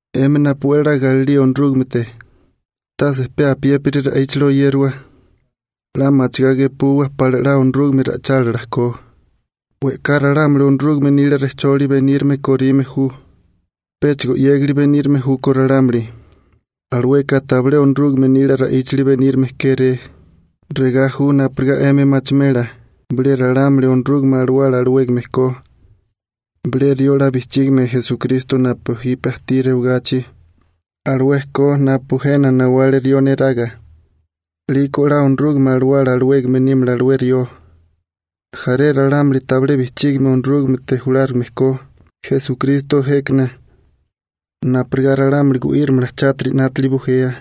'Emi napu 'we 'la galilía Onorúgamete, tase pe apiépiri ra'íchili oyériwa. 'La machigá gepuwa pala 'la Onorúgame ra'ichálila ko. We'ká ralámuli Onorúgame nila rejcholi benírime korime ju, péchigo 'yégali benírime júkó ralámuli. Alueka tabilé Onorúgame nila ra'íchali benírime kéré. Regá ju napurigá 'emi machimela bilé ralámuli Onorúgame Alawala alawégame ko: Bilé rió 'la bijchígame Esukristo napu ajtí jipe rewagachi alué ko napu jena nawale rió neraga, 'liko 'la Onorúgame Alawala alawégame nímala alué rió. Jaré ralámuli tabilé bijchígame Onorúgamete julárigame ko Esukristo jékana napurigá ralámuli gu'írimala chátiri 'nátili bujea,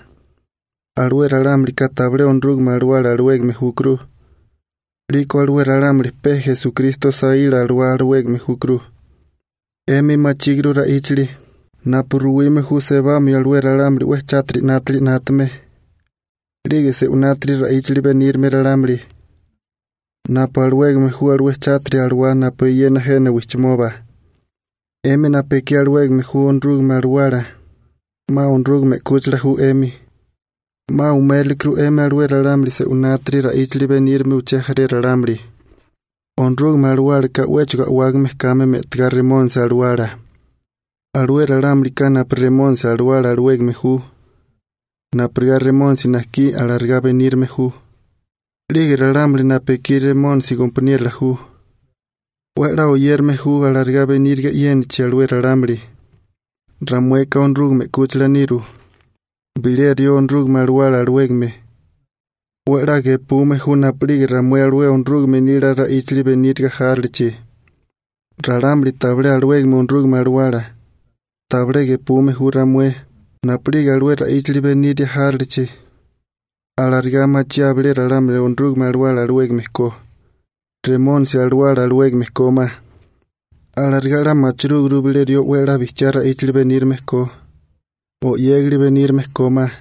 alué ralámulika tabilé Onorúgame Alawala alawégame júkuru, 'liko alué ralámuli pe Esukristo saíla alawá alawégame júkuru. 'Emi machíguru ra'íchali napu ruwime ju sebamio alué ralámuli 'we chátiri 'nátili 'nátame 'lige se'winátiri ra'íchali benírime ralámuli, napu alawégame ju alué chátiri alawá napu eyena jena wijchimoba. 'Emi napu ekí alawégame ju Onorúgame Alawala 'ma Onorúgame 'kúchila ju 'emi. 'Ma umérilekuru 'emi alué ralámuli se'winátiri ra'íchali benírime uché jaré ralámuli, Onorúgame Alawálaka 'wéchigo a'wágame kame me'tigá Remónisi alawala. Alué ralámulika napu Remónisi alawala alawégame ju, napurigá Remónisi najkí alarigá benírime ju. 'Lige ralámuli napu ekí Remónisi gompaniérola ju 'we 'la oyérame ju alarigá beníriga e'yénachi alué ralámuli. Ramueka Onorúgame 'kúchila niru, bilé rió Onorúgame Alawala alawégame 'we 'la gepume ju napu'lige ramué alué Onorúgame nila ra'íchali beníriga járilichi. Ralámuli tabilé alawégame Onorúgame Alawala tabilé gepume ju ramué napu'lige alué ra'íchali beniria járilichi. Alarigá machiáa bilé ralámuli Onorúgame Alawala alawégame ko, Remónisi alawala alawégame kómá. Alarigá 'la machirúguru bilé rió 'we 'la bijchiá ra'íchali benírime ko o 'yégali benírime kómá.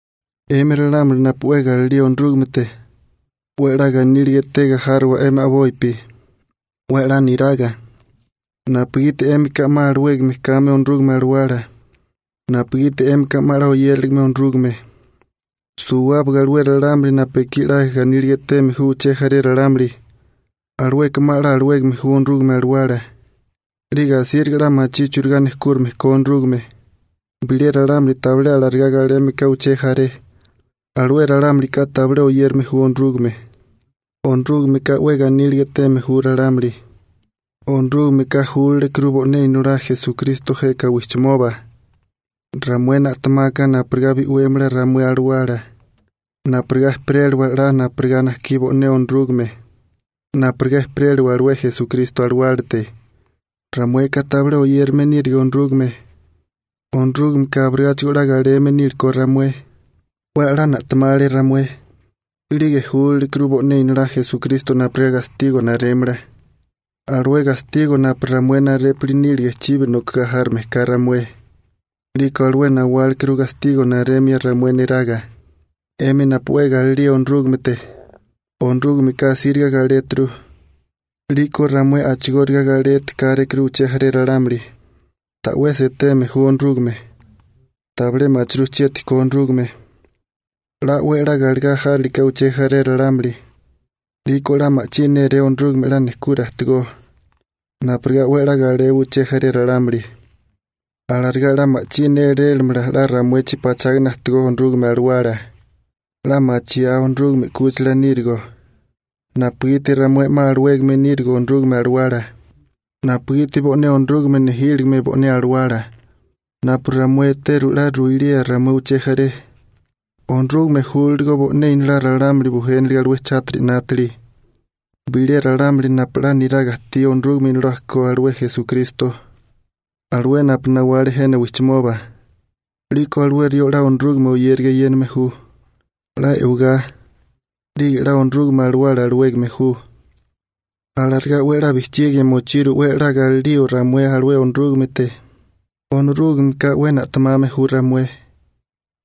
'Emi ralámuli napu 'we galilía Onorúgamete, 'we 'la ganíliga etega járowa 'émi a'bopi, 'we 'la niraga, napugiti 'émika 'ma alawégame kame Onorúgame Alawala napugiti 'émika 'ma 'la oyériligame Onorúgame. Suwábaga alué ralámuli napu ekí 'la ganíliga eteme ju uché jaré ralámuli, alueka 'ma 'la alawégame ju Onorúgame Alawala, 'lige asíriga 'la machí churigá nejkúrime ko Onorúgame. Bilé ralámuli tabilé alarigá galeme ka uché jaré, alué ralámulika tabilé oyérame ju Onorúgame. Onorúgameka 'we ganíliga eteme ju ralámuli. Onorúgameka júlalekuru bo'né Inolá Esukristo jeka wijchimoba ramué na'temaka napurigá bi'wémala ramué alawala napurigá ejperéliwa 'la napurigá najkí alué bo'né Onorúgame, napurigá ejperéliwa alué Esukristo a'walílate. Ramueka tabilé oyérame nírige Onorúgame, Onorúgameka abirigáchigo 'la galeme nílekó ramué. 'We 'la na'temale ramué, 'lige júlalekuru bo'né Inolá Esukristo napurigá gastigo narémala, alué gastigo napu ramué narépuli nílige chibi nokagá járame ka ramué. 'Liko alué nawálekuru gastigo naremia ramué neraga. 'Emi napu 'we galilía Onorúgamete, Onorúgameka asíriga galéturu, 'liko ramué a'chigóriga galeti kárékuru uché jaré ralámuli. Ta'wesi eteme ju Onorúgame, tabilé machirú chieti ko Onorúgame. 'La 'we 'la galegá járiliká uché jaré ralámuli, 'liko 'la ma'chí néré Onorúgame 'la nejkura ajtigó napurigá 'we 'la galewa uché jaré ralámuli. Alarigá 'la ma'chí nélélamala 'la ramuechi pachágana ajtigó Onorúgame Alawala. 'La machiáa Onorúgame 'kúchila nírigo napugiti ramué 'ma alawégame nírigo Onorúgame Alawala, napugiti bo'né Onorúgame nejíligime bo'né Alawala. Napu ramué eteru 'la ruilía ramué uché jaré, Onorúgame júlaligo bo'né Inolá ralámuli bujéniliga alué chátiri 'nátili. Bilé ralámuli napu 'la niraga ajtí Onorúgame Inolá ko alué Esukristo, alué napu nawale jena wijchimoba, 'liko alué rió 'la Onorúgame oyériga eyéname ju, 'la e'wagá, 'lige 'la Onorúgame Alawala alawégame ju. Alarigá 'we 'la bijchigia mochiru 'we galilío ramué alué Onorúgamete. Onorúgameka 'we na'temame ju ramué.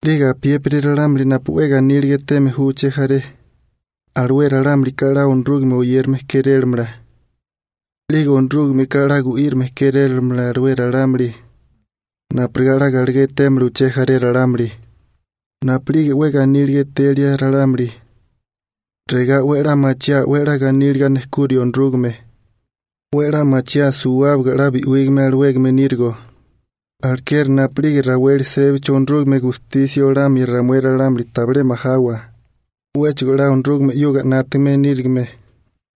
'Lige apiépiri ralámuli napu 'we ganíliga eteme ju uché jaré, alué ralámulika 'la Onorúgame oyérame kérélamala, 'lige Onorúgameka 'la gu'írame kérélamala alué ralámuli napurigá 'la galegá etémala uché jaré ralámuli. Napu'lige 'we ganíliga etelia ralámuli, regá 'we 'la machiaa 'we 'la ganíliga nejkurio Onorúgame. 'We 'la machiaa suwábaga 'la bi'wígame alawégame nírigo, alekeri napu'lige raweli sébachi Onorúgame gustisia olamia ramué ralámuli tabilé majawa, 'wéchigo 'la Onorúgame 'yuga 'nátame nírigime.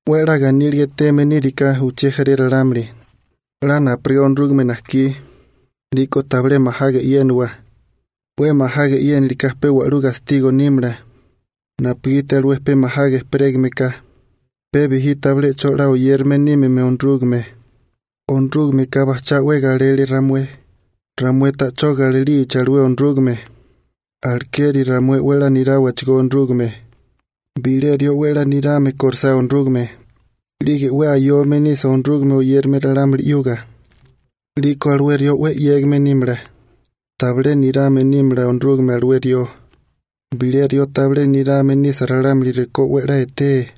'We 'la ganíliga eteme níriká uché jaré ralámuli 'la napurigá Onorúgame najkí, 'liko tabilé majaga e'yéniwa, 'we majaga e'yéniliká pe wa'lú gastigo nímala, napugiti alué pe majaga ejperégameká pe bijí tabilé 'cho 'la oyérame nímime Onorúgame. Onorúgameka bajchá 'we galele ramué, ramué ta'chó galilichi alué Onorúgame, alekeri ramué 'we 'la niráwachigó Onorúgame. Bilé rió 'we 'la nirame kórisá Onorúgame, 'lige 'we ayome nisa Onorúgame oyérame ralámuli 'yuga, 'liko alué rió 'we 'yégame nímala, tabilé nirame nímala Onorúgame alué rió. Bilé rió tabilé nirame nisa ralámuli rekó 'we 'la etee,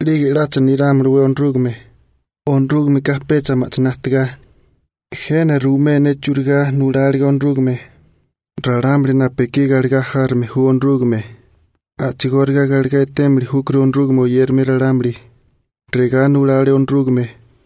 ¿'lige 'lacha nirámalawé Onorúgame? Onorúgameka pecha ma'chiná ajtigá. Jena ruimé ne churigá nuláliga Onorúgame: Ralámuli napu ekí galegá járome ju Onorúgame, a'chigóriga galegá etémili júkuru Onorúgame oyérame ralámuli. Regá nulale Onorúgame.